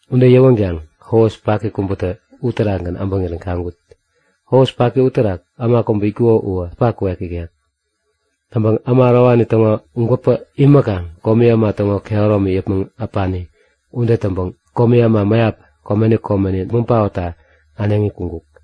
Ude yäwänkaŋ hos paki kubätä uterakgän äbäŋirän kaŋkut. Hos paki uterak äma kubä itkuko uwä äpa kuek ikek. Täŋpäŋ äma ärowani täŋo gwäpä imäkaŋ komi äma täŋo kehäromi yäpmäŋ äpani ude täŋpäŋ komi äma mäyap komeni komeni däpmäŋ paotta äneŋi kuŋkuk.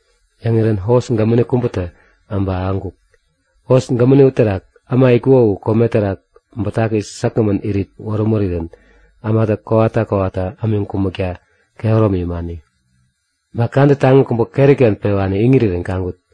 Yäŋirän hos gämäni kubätä äbä ahäŋkuk. Hos gämäni uterak äma itkuko u kome terak bätaki säkgämän irit wärämurirän ämatä kowata kowata ämiŋ kumäkta kehäromi imani. Ba kadä taŋi kubä keri-ken pewani iŋirirän kaŋkut.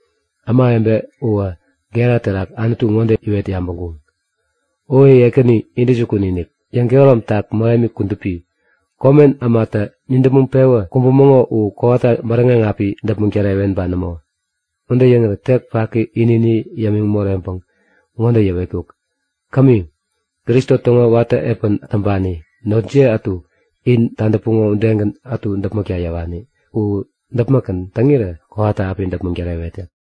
Ämawebe uwä gera terak Anutu ŋode iwet yabäŋkuŋ; O Ekäni intäjukun-inik, yäŋkehäromtak mähemi kudupi, komen ämatä nidäpmäŋ-pewä kumbumäŋo u kowata bäräŋeŋ api däpmäŋ tärewen ba nämo? Ude yäŋirä tek paki ini-ini yämiŋ moreŋpäŋ ŋode yäwetkuk; Kämi. Kristo täŋo watä epän täŋpani notjiye ätu, in tadäpuŋo udegän ätu däpmäkta yäwani u däpmäkgän täŋirä kowata api däpmäŋ tärewet yäk.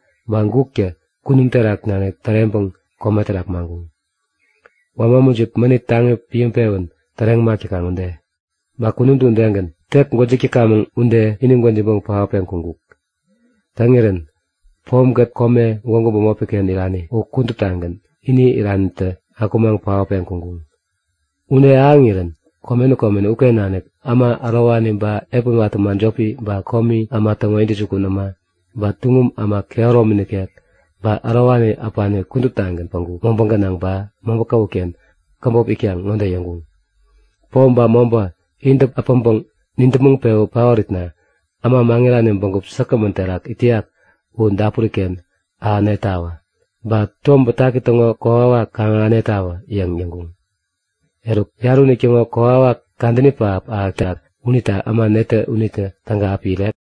Ba guktä kunum terak nanik täreŋpäŋ kome terak maŋkuŋ, wama mujip mänit taŋi piäŋpewän täreŋ mak täkaŋ ude. Ba kunumtä udegän, tek gwäjik täkamäŋ ude ini gwäjiŋpäŋ paotpeŋ kuŋkuk. Täŋirän pomkät, kome gwägu bämopi-ken irani u kuduptagän ini iranitä akumaŋ paotpeŋ kuŋkuŋ. Ude ahäŋirän komeni komeni uken nanik äma ärowani ba epän watä äma jopi, ba komi äma täŋo intäjukun äma, ba tuŋum äma kehäromi nikek, ba ärowani äpani kuduptagän päŋku mobä gänaŋ ba mobä käwut-ken käbop itkaŋ ŋode yäŋkuŋ; Pom ba mobä intä äpäŋpäŋ nidäpmäŋ-pewä paoritna äma maŋirani bägup säkgämän terak it täyak u dapuri-ken ahänetawä! Ba Tom Bätaki täŋo kokwawak kaŋ-ahänetawä yäŋ yäŋkuŋ. Eruk yarä unitäŋo kokwawak kadäni pähap ahätak unita äma netä unitä täga api irek?